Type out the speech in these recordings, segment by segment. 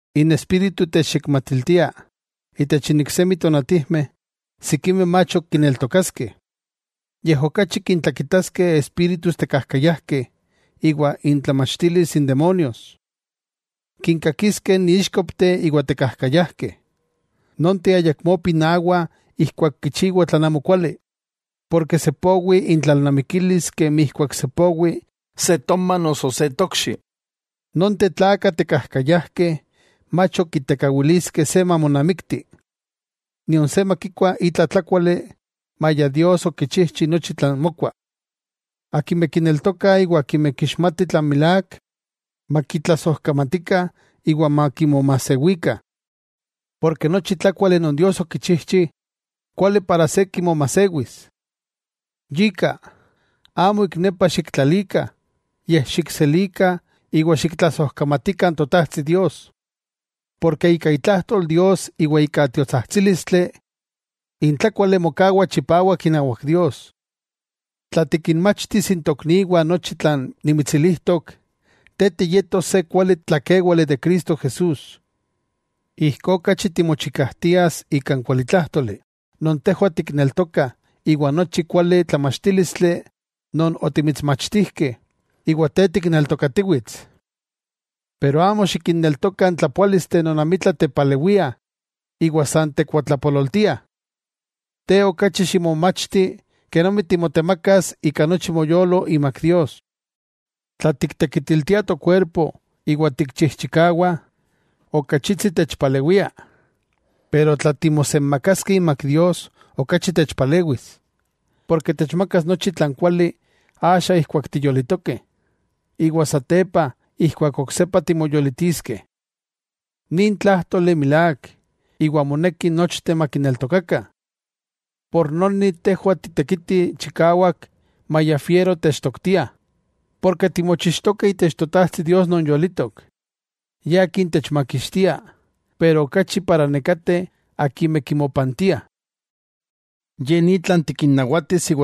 N Espíritu techyekmatiltia itech iksemi tonatijmeh sikimeh mach ok kineltokaskeh. Yej okachi kintlakitaskeh espíritus tekajkayajkeh iwa intlamachtilis n demonios. Kinkakiskeh n íxkopteh iwa tekajkayajkeh, nonteh ayakmó pinawah ijkuak kichiwah tlan amokuali, ken sepowi intlalnamikilis kemi ijkuak sepowi se toma noso se tokxi. Nonteh tlakah tekajkayajkeh mach ok kitekawiliskeh se mamonamikti, nion se makikua itla tlákuali, maya Dios okichijchi nochi tlan mokua. Akimeh kineltokah iwa akimeh kixmatih tlan milák, makitlasojkamatikah iwa makimomajsewikah. Nochi tlákuali non Dios okichijchi, kuali se kimomajsewis. Yika, amo ik nepa xiktlalikah, yej xikselikah iwa xiktlasojkamatilikah n Totajtsi Dios. Porke ika itlajtol Dios iwa ika tiotsajtsílistli, n tlákuali mokawa chipawak inawak Dios. Tla tikinmachtis n tokniwah nochi tlan nimitsilijtok, te tiyetos se kuali tlakéwale de Cristo Jesús. Ijkó okachi timochikajtias ika n kualitlájtoli non tejwah tikneltokah iwa ika nochi kuali tlamachtílistli non otimitsmachtijkeh iwa te tikneltokatiwits. Pero amo xikinneltoka n tlapoálisteh non amitla tepalewiah iwa san tekuatlapololtiah. Te okachi ximomachti kenomi timotemakas ika nochi moyolo imak Dios, tla tiktekitiltiah tokuerpo iwa tikchijchikawah, okachitsi techpalewia, pero tla timosenmakaskeh imak Dios okachi techpalewis, porke techmakas nochi tlan kuali axa ijkuak tiyolitokeh, iwa satepa ijkuak oksepa timoyolitiskeh. Nin tlájtoli milák iwa moneki nochteh makineltokakah. Por noni, tejwah titekitih chikawak maya fiero techtoktiah, porke timochixtokeh itech Totajtsi Dios non yolitok, Ye Akin techmakixtia, iwa okachi nekateh akimeh kimopantiah. Ye ni tlan moneki tikinnawatis.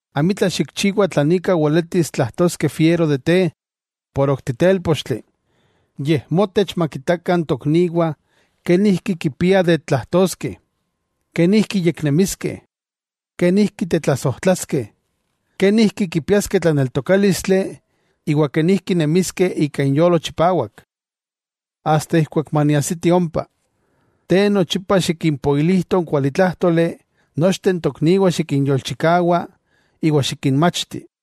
Amitla xikchiwa tlan ika weletis tlajtoskeh fiero de te por ok titélpochtli. Yej motech makitakah n tokniwah kenijki kipiah de tlajtoskeh, kenijki yeknemiskeh, kenijki tetlasojtlaskeh, kenijki kipiaskeh tlaneltokálistli iwa kenijki nemiskeh ika inyolo chipawak. Asta keman maniajsiti ompa, te nochipa xikimpoilijto n kualitlájtoli nochteh n tokniwah xikinyolchikawa iwa xikinmachti.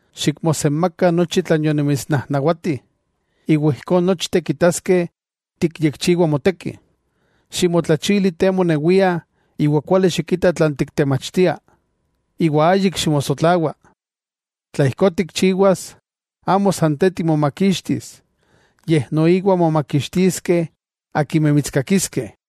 Xikmosenmaka nochi tlan yonimitsnajnawati, iwa ijkó nochteh kitaskeh tikyekchiwa moteki. Ximotlachili te monewia iwa kuali xikita tlan tiktemachtia, iwa ayik ximosojsotlawa. Tla ijkó tikchiwas, amo san te timomakixtis, yej noiwa momakixtiskeh akimeh mitskakiskeh.